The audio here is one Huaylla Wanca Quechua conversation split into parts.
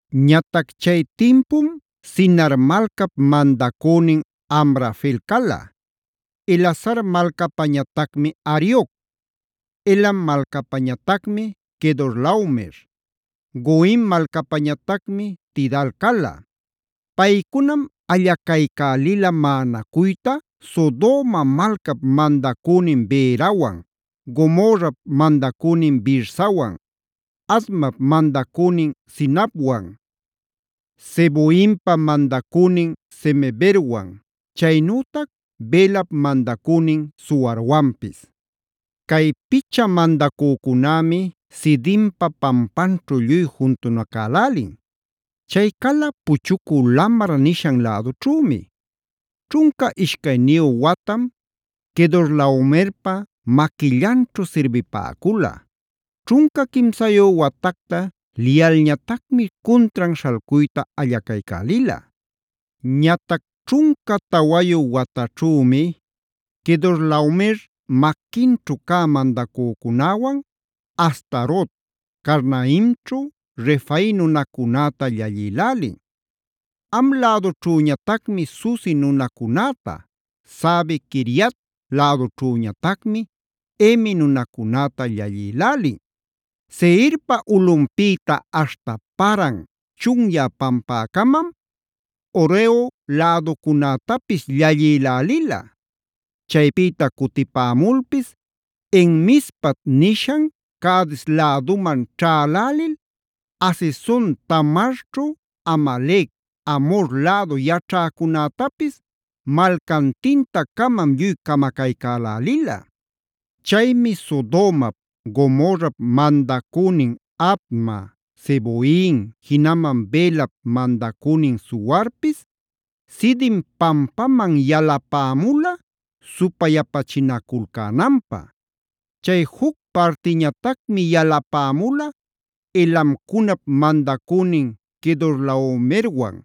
Ñatac chay timpum Sinar malcap mandacünin Amrafel cala; Elasar malcapañatacmi Arioc; Elam malcapañatacmi Quedorlaomer; Goim malcapañatacmi Tidal cala. Paycunam allacaycälila maꞌanacuyta Sodoma malcap mandacünin Berawan, Gomorrap mandacünin Birsawan, Admap mandacünin Sinabwan, Zeboimpa mandacünin Semeberwan, chaynütac Belap mandacünin Zoarwanpis. Cay picha mandacücunämi Sidimpa pampanćhu lluy juntunacälälin. Chay cala “Puchucü Lamar” nishan lädućhümi. Ćhunca ishcayniyu watam Quedorlaomerpa maquillanćhu sirbipäcula. Ćhunca quimsayu watacta liyalñatacmi cuntran śhalcuyta allacaycälila. Ñatac ćhunca tawayu wataćhümi Quedorlaomer maquinćhu cä mandacücunäwan Astarot Carnaimćhu Refai nunacunäta llallïlälin. Ham lädućhüñatacmi Zuzi nunacunäta, Save-quiriat lädućhüñatacmi Emi nunacunäta llallïlälin. Seirpa ulꞌunpïta aśhta Paran chunyä pampäcamam Horeo läducunätapis llallïlälila. Chaypïta cutipämulpis En-mispat nishan Cades läduman ćhälälil Hazezon-tamarćhu Amalec, Amhor lädu yaćhäcunätapis malcantinta-camam lluy camacaycälälila. Chaymi Sodomap, Gomorrap mandacünin Adma, Zeboim, jinaman Belap mandacünin Zoarpis Sidim pampaman yalapämula supayapachinaculcänanpä. Chay juc partiñatacmi yalapämula Elamcunap mandacünin Quedorlaomerwan,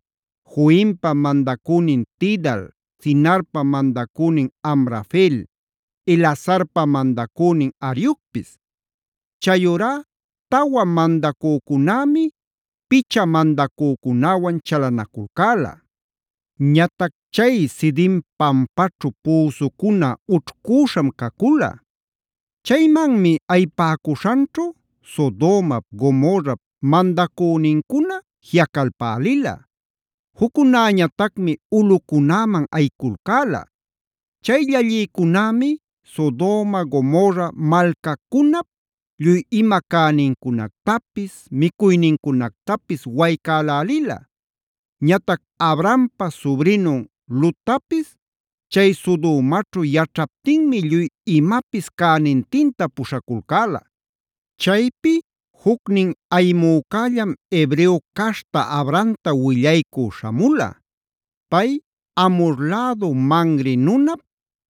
Goimpa mandacünin Tidal, Sinarpa mandacünin Amrafel, Elasarpa mandacünin Ariocpis. Chayurá tawa mandacücunämi picha mandacücunäwan chalanaculcäla. Ñatac chay Sidim pampaćhu püsucuna ućhcüśham cacula. Chaymanmi ayipäcuśhanćhu Sodomap, Gomorrap mandacünincuna jiꞌacalpälila. Juccunäñatacmi ulꞌucunäman ayiculcäla. Chay llallïcunämi Sodoma Gomorra malcacunap lluy ima cänincunactapis, micuynincunactapis waycälälila. Ñatac Abrampa subrinun Lottapis chay Sodomaćhu yaćhaptinmi lluy imapis cänintinta puśhaculcäla. Chaypi jucnin ayimücällam Hebreo caśhta Abramta willaycü śhamula. Pay Amhor lädu Mamre nunap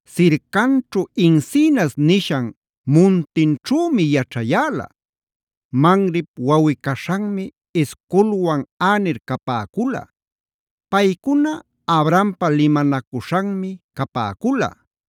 sircanćhu encinas nishan muntinćhümi yaćhayäla. Mamrep wawꞌi-caśhanmi Escolwan Aner capäcula; paycuna Abrampa limanacuśhanmi capäcula.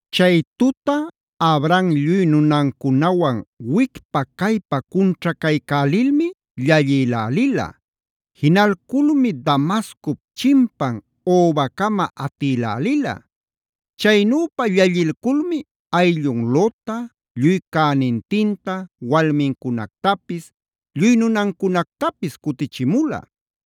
Chay tuta Abram lluy nunancunawan wicpa-caypa cunćhacaycälilmi llallïlälila. Jinalculmi Damascop chimpan Hobacama atïlälila. Chaynüpa llallilculmi ayllun Lotta, lluy cänintinta, walmincunactapis, lluy nunancunactapis cutichimula.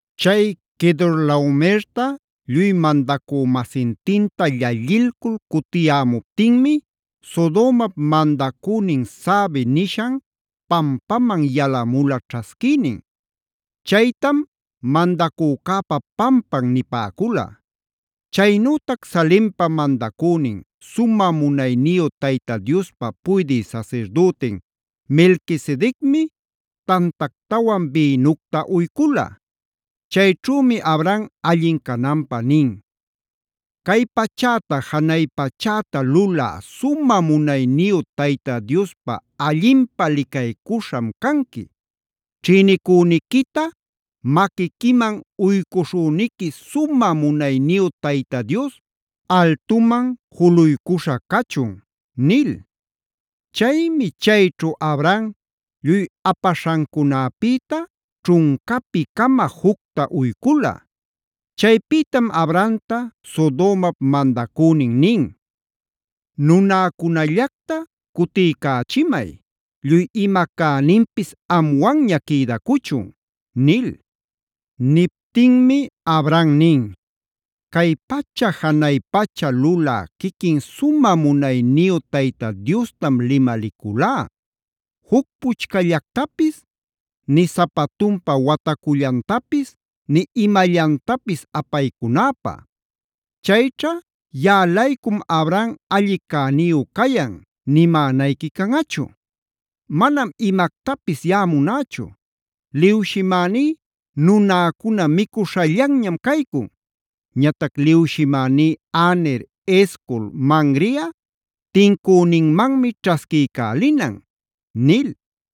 Chay Quedorlaomerta lluy mandacü-masintinta llallilcul cutiyämuptinmi Sodomap mandacünin Save nishan pampaman yalamula ćhasquïnin. Chaytam “Mandacücäpa pampan” nipäcula. Chaynütac Salempa mandacünin, sumä munayniyu Tayta Diospa puydï sasirdütin Melquisedecmi tantactawan bïnucta uycula. Chayćhümi Abram allin cananpä nin: “Cay pachäta janay pachäta lulä sumä munayniyu Tayta Diospa allinpä licaycuśham canqui. Ćhïnicüniquita maquiquiman uycuśhüniqui sumä munayniyu Tayta Dios altuman juluycuśha cachun” nil.a Chaymi chayćhu Abram lluy apaśhancunäpïta ćhuncapi-cama jucta uycula. Chaypïtam Abramta Sodomap mandacünin nin: “Nunäcunallacta cutiycächimay, lluy ima cäninpis amwanña quïdacuchun” nil. Niptinmi Abram nin: “Cay pacha janay pacha lulä quiquin sumä munayniyu Tayta Diostam limaliculá juc puchcallactapis, nï sapatunpa watacullantapis, nï imallantapis apaycunäpä. Chayćha ‘yaꞌa-laycum Abram alli cäniyu cayan’ nimänayqui canꞌachu. Manam imactapis yaꞌa munächu; liwshimäní nunäcuna micuśhallanñam caycun. Ñatac liwshimäní Aner, Escol, Mamreꞌa tincüninmanmi ćhasquiycälinan” nil.